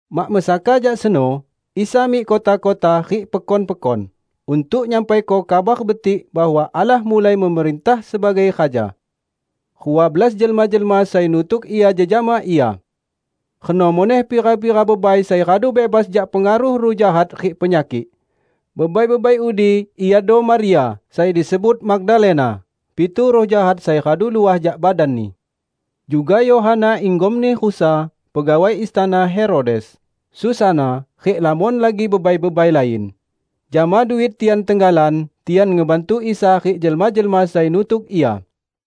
Mak mesaka jak seno, Isa mik kota-kota rik pekon-pekon, untuk nyampaiko Kabar Betik bahwa Allah mulai memerintah sebagai Raja. Rua belas jelma-jelma sai nutuk Ia jejama Ia. Reno muneh pira-pira bebai sai radu bebas jak pengaruh ruh jahat rik penyakik. Bebai-bebai udi iado Maria sai disebut Magdalena (pitu ruh jahat sai radu luah jak badanni); juga Yohana, inggomni Khuza, pegawai istana Herodes, Susana rik lamon lagi bebai-bebai lain. Jama duit tian tenggalan, tian ngebantu Isa rik jelma-jelma sai nutuk Ia.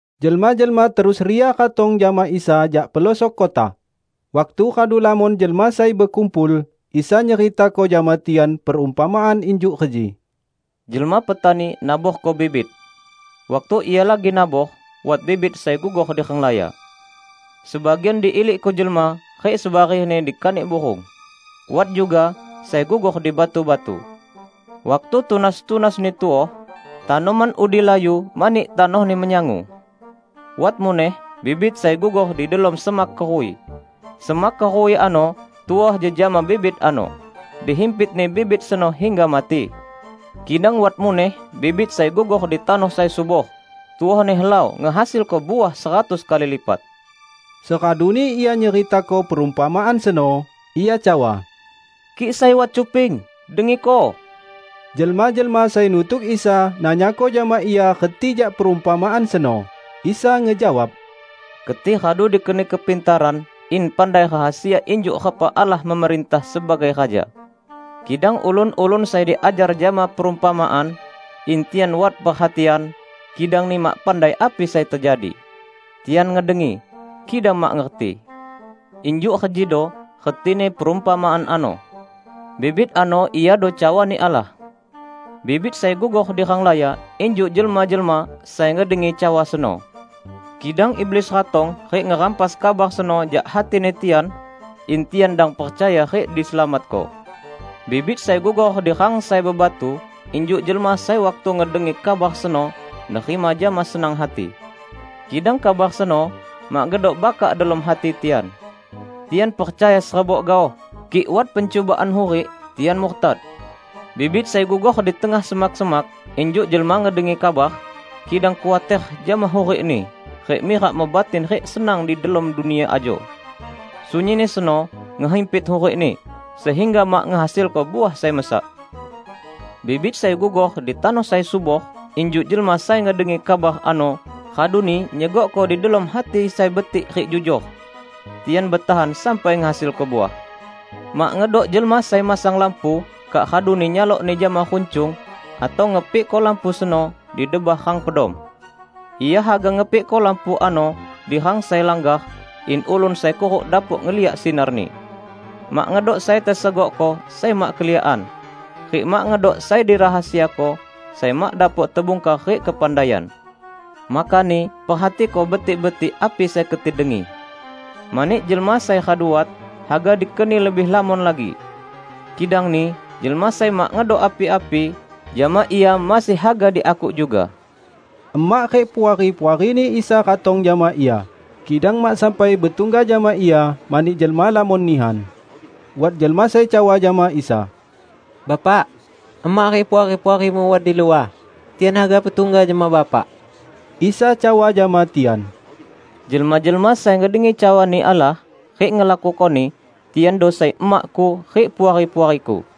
Jelma-jelma terus ria ratong jama Isa jak pelosok kota. Waktu radu lamon jelma sai bekumpul, Isa nyeritako jama tian perumpamaan injuk reji: "Jelma petani naborko bibit. Waktu ia lagi nabor, wat bibit sai gugor di renglaya. Sebagian diilikko jelma rik sebarehni dikanik burung. Wat juga sai gugor di batu-batu. Waktu tunas-tunasni tuoh, tanoman udi layu mani tanohni menyangu. Wat muneh bibit sai gugor di delom semak keruwi. Semak keruwi ano tuoh jejama bibit ano, dihimpitni bibit seno hingga mati. Kidang wat muneh bibit sai gugor di tanoh sai subor, tuohni helau ngehasilko uah seratus kali lipat." Seraduni Ia nyeritako perumpamaan seno, Ia cawa, "Kik sai wat cuping, dengiko!" Jelma-jelma sai nutuk Isa nanyako jama Ia reti jak perumpamaan seno. Isa ngejawab, "Keti radu dikeni kepintaran in pandai rahasia injuk repa Allah memerintah sebagai Raja. Kidang ulun-ulun sai diajar jama perumpamaan, in tian wat perhatian, kidangni mak pandai api sai tejadi; tian ngedengi, kidang mak ngerti." "Injuk rejido retini perumpamaan ano: Bibit ano iado cawani Allah. Bibit sai gugor di renglaya injuk jelma-jelma sai ngedengi cawa seno. Kidang iblis ratong rik ngerampas kabar seno jak hatini tian, in tian dang percaya rik diselamatko. Bibit sai gugor di rang sai bebatu injuk jelma sai waktu ngedengi kabar seno, nerima jama senang hati. Kidang kabar seno mak ngedok bakak delom hati tian. Tian percaya serebok gaoh, kik wat pencubaan hurik, tian murtad. Bibit sai gugor di tengah semak-semak injuk jelma ngedengi kabar, kidang khuater jama hurikni rik mirak mebatin rik senang delom dunia ajo. Sunyinni seno ngehimpit hurikni, sehingga mak ngehasilko uah sai mesak. Bibit sai gugor di tanoh sai subor, injuk jelma sai ngedengi kabar ano, raduni nyegokko di delom hati sai betik rik jujor. Tian betahan sampai ngehasilko uah." "Mak ngedok jelma sai masang lampu kak raduni nyalokni jama runcung, atau ngepikko lampu seno di debah rang pedom. Ia haga ngepikko lampu ano di rang sai langgar, in ulun sai kuruk dapok ngeliak sinarni. Mak ngedok sai tesegokko sai mak keliakan; rik mak ngedok sai dirahasiako sai mak dapok tebungkar rik kepandaian. Makani perhatiko betik-betik api sai keti dengi. Mani jelma sai radu wat, haga dikeni lebih lamon lagi; kidangni jelma sai mak ngedok api-api jama ia masih haga diakuk juga." Emak rik puari-puarini Isa ratong jama Ia, kidang mak sampai betungga jama Ia mani jelma lamon nihan. Wat jelma sai cawa jama Isa, "Bapak, emak rik puari-puari-Mu wat di luah. Tian haga betungga jama Bapak." Isa cawa jama tian, "Jelma-jelma sai ngedengi cawani Allah rik ngelakukoni, tiando sai emak-Ku rik puari-puari-Ku."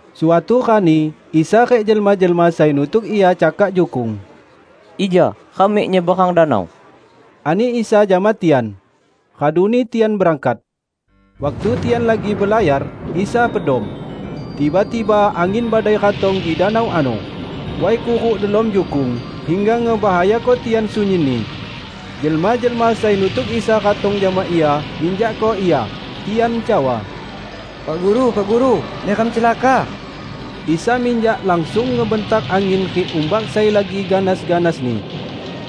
Suatu rani Isa rik jelma-jelma sai nutuk Ia cakak jukung. "Ija ram mik nyeberang danau," ani Isa jama tian. Raduni tian berangkat. Waktu tian lagi belayar, Isa pedom. Tiba-tiba angin badai ratong di danau ano. Way kuruk delom jukung, hingga ngebahayako tian sunyinni. Jelma-jelma sai nutuk Isa ratong jama Ia, nginjakko Ia. Tian cawa, "Pak Guru, Pak Guru, neram celaka!" Isa minjak langsung ngebentak angin rik umbak sai lagi ganas-ganasni.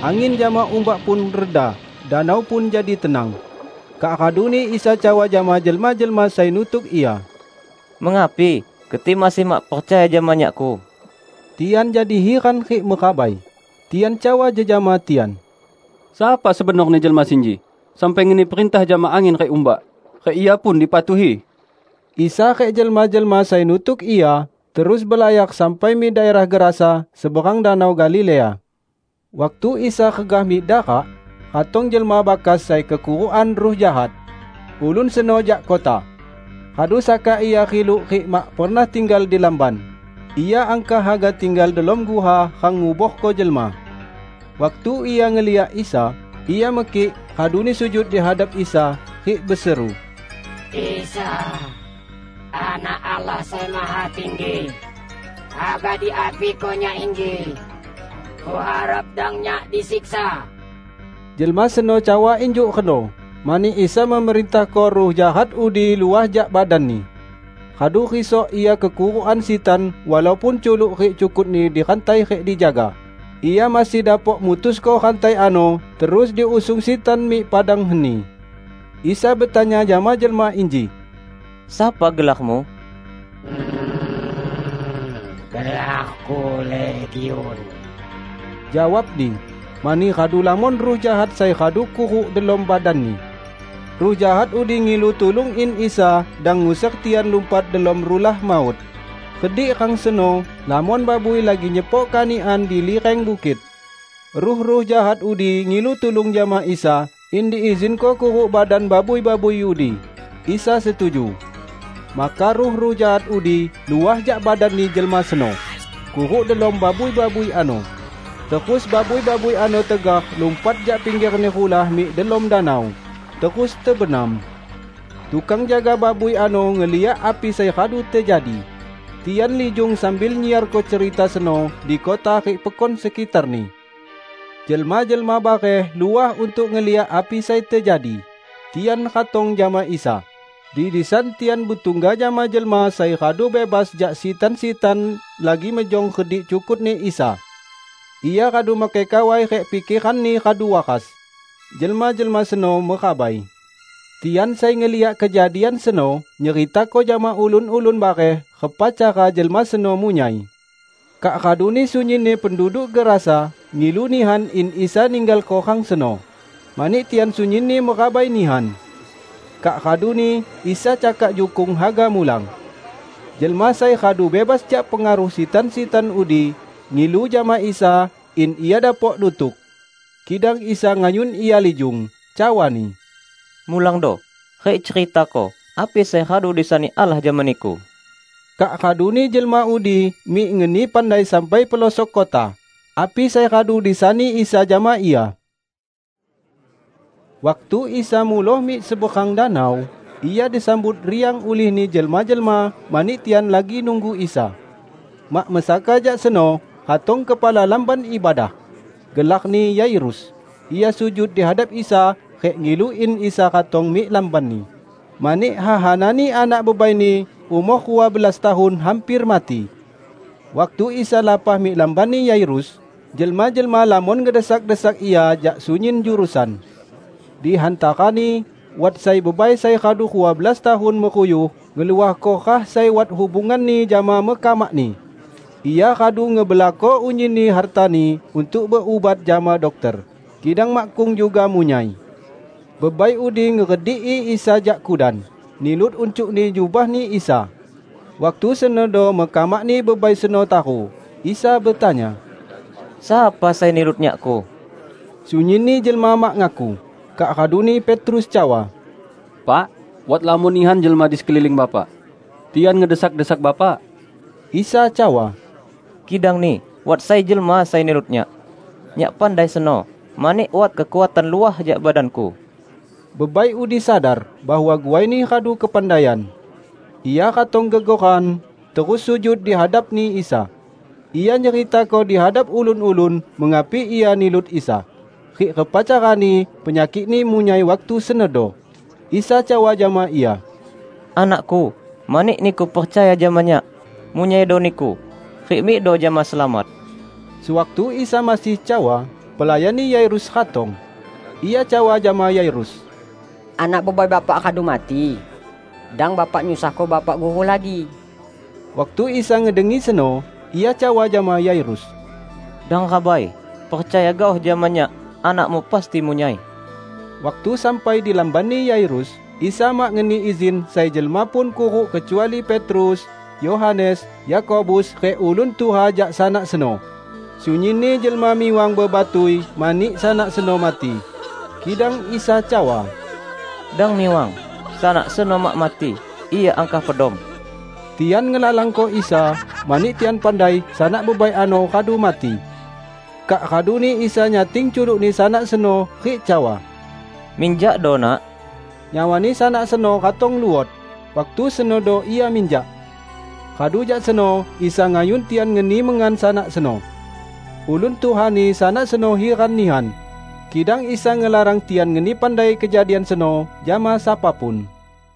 Angin jama umbak pun reda danau pun jadi tenang. Kak raduni Isa cawa jama jelma-jelma sai nutuk Ia, "Mengapi keti masih mak percaya jama Nyak-Ku?" Tian jadi hiran rik merabai. Tian cawa jejama tian, "Sapa sebenorni jelma sinji sampai ngeni perintah jama angin rik umbak, rik Ia pun dipatuhi!" Isa rik jelma-jelma sai nutuk Ia terus belayar sampai mik daerah Gerasa seberang Danau Galilea. Waktu Isa regah mik darak, ratong jelma bakas sai kekurukan ruh jahat. Ulun seno jak kota. Radu saka ia riluk rik mak pernah tinggal di lamban. Ia angkah haga tinggal delom guha rang nguborko jelma. Waktu ia ngeliak Isa, ia mekik raduni sujud di hadap Isa rik beseru, "Isa, Anak Allah Sai Mahatinggi! Haga diapiko nyak inji? Kuharap dang nyak disiksa!" Jelma seno cawa injuk reno mani Isa memerintahko ruh jahat udi luah jak badanni. Radu risok ia kekurukan sitan walaupun culuk rik cukutni dirantai rik dijaga, ia masih dapok mutusko rantai ano terus diusung sitan mik padang heni. Isa betanya jama jelma inji, "Sapa gelarmu?" "Gelarku 'Legiun'," jawabni -- mani radu lamon ruh jahat sai radu kuruk delom badanni. Ruh jahat udi ngilu tulung in Isa dang nguser tian lumpat delom Rulah Maut. Redik rang seno lamon babui lagi nyepok kanikan di lireng bukit. Ruh-ruh jahat udi ngilu tulung jama Isa in diizinko kuruk badan babui-babui udi, Isa setuju. Maka ruh-ruh jahat udi luah jak badanni jelma seno, kuruk delom babui-babui ano, terus babui-babui ano tegar lumpat jak pinggerni rulah mik delom danau, terus tebenam. Tukang jaga babui ano ngeliak api sai radu tejadi. Tian lijung sambil nyiarko cerita seno di kota rik pekon sekitarni. Jelma-jelma bareh luah untuk ngeliak api sai tejadi. Tian ratong jama Isa, di disan tian betungga jama jelma sai radu bebas jak sitan-sitan lagi mejong redik cukutni Isa. Ia radu makai kawai rik pikeranni radu waras. Jelma-jelma seno merabai. Tian sai ngeliak kejadian seno nyeritako jama ulun-ulun bareh repa cara jelma seno munyai. Kak raduni sunyinni penduduk Gerasa ngilu nihan in Isa ninggalko rang seno, mani tian sunyinni merabai nihan. Kak raduni Isa cakak jukung haga mulang. Jelma sai radu bebas jak pengaruh sitan-sitan udi, ngilu jama Isa in ia dapok nutuk. Kidang Isa ngayun ia lijung, cawa-Ni, "Mulangdo rik ceritako api sai radu disani Allah jama niku." Kak raduni jelma udi mik ngeni pandai sampai pelosok kota, api sai radu disani Isa jama ia. Waktu Isa muloh mik seberang danau, Ia disambut riang ulihni jelma-jelma mani tian lagi nunggu Isa. Mak mesaka jak seno ratong kepala lamban ibadah. Gelarni Yairus. Ia sujud di hadap Isa rik ngilu in Isa ratong mik lambanni, mani hehanani anak bebaini umor rua belas tahun hamper mati. Waktu Isa lapah mik lambanni Yairus, jelma-jelma lamon ngedesak-desak Ia jak sunyin jurusan. Di hantarani wat sai bebai sai radu rua belas tahun meruyuh ngeluahko rah sai wat hubunganni jama mekamakni. Ia radu ngebelakko unyinni hartani untuk berubat jama dokter, kidang makkung juga munyai. Bebai udi ngerediki Isa jak kudan, nilut uncukni jubah-Ni Isa. Waktu senodo mekamakni bebai seno taru. Isa betanya, "Sapa sai nilut Nyakku?" Sunyinni jelma mak ngaku. Kak raduni Petrus cawa, "Pak, wat lamon nihan jelma di sekeliling Bapak; tian ngedesak-desak Bapak!" Isa cawa, "Kidangni wat sai jelma sai nilut Nyak. Nyak pandai seno, mani wat kekuatan luah jak badan-Ku." Bebai udi sadar bahwa guaini radu kepandaian. Ia ratong gegoran, terus sujud di hadapni Isa. Ia nyeritako di hadap ulun-ulun, mengapi ia nilut Isa, rik repa carani penyakikni munyai waktu senodo. Isa cawa jama ia, "Anak-Ku, mani niku percaya jama Nyak, munyaido niku. Rik mikdo jama selamat." Sewaktu Isa masih cawa, pelayanni Yairus ratong. Ia cawa jama Yairus, "Anak bebai Bapak radu mati. Dang Bapak nyusahko Bapak Guru lagi." Waktu Isa ngedengi seno, Ia cawa jama Yairus, "Dang rabai. Percaya gaoh jama Nyak anakmu pasti munyai." Waktu sampai di lambanni Yairus, Isa mak ngeni izin sai jelma pun kuruk kecuali Petrus, Yohanes, Yakobus rik ulun tuha jak sanak seno. Sunyinni jelma miwang bebatui mani sanak seno mati. Kidang Isa cawa, "Dang miwang. Sanak seno mak mati, ia angkah pedom!" Tian ngelalangko Isa, mani tian pandai sanak bebai ano radu mati. Kak raduni Isa nyating culukni sanak seno rik cawa, "Minjakdo, Nak!" Nyawani sanak seno ratong luot, waktu senodo ia minjak. Radu jak seno Isa ngayun tian ngeni mengan sanak seno. Ulun tuhani sanak seno hiran nihan. Kidang Isa ngelarang tian ngeni pandai kejadian seno jama sapa pun.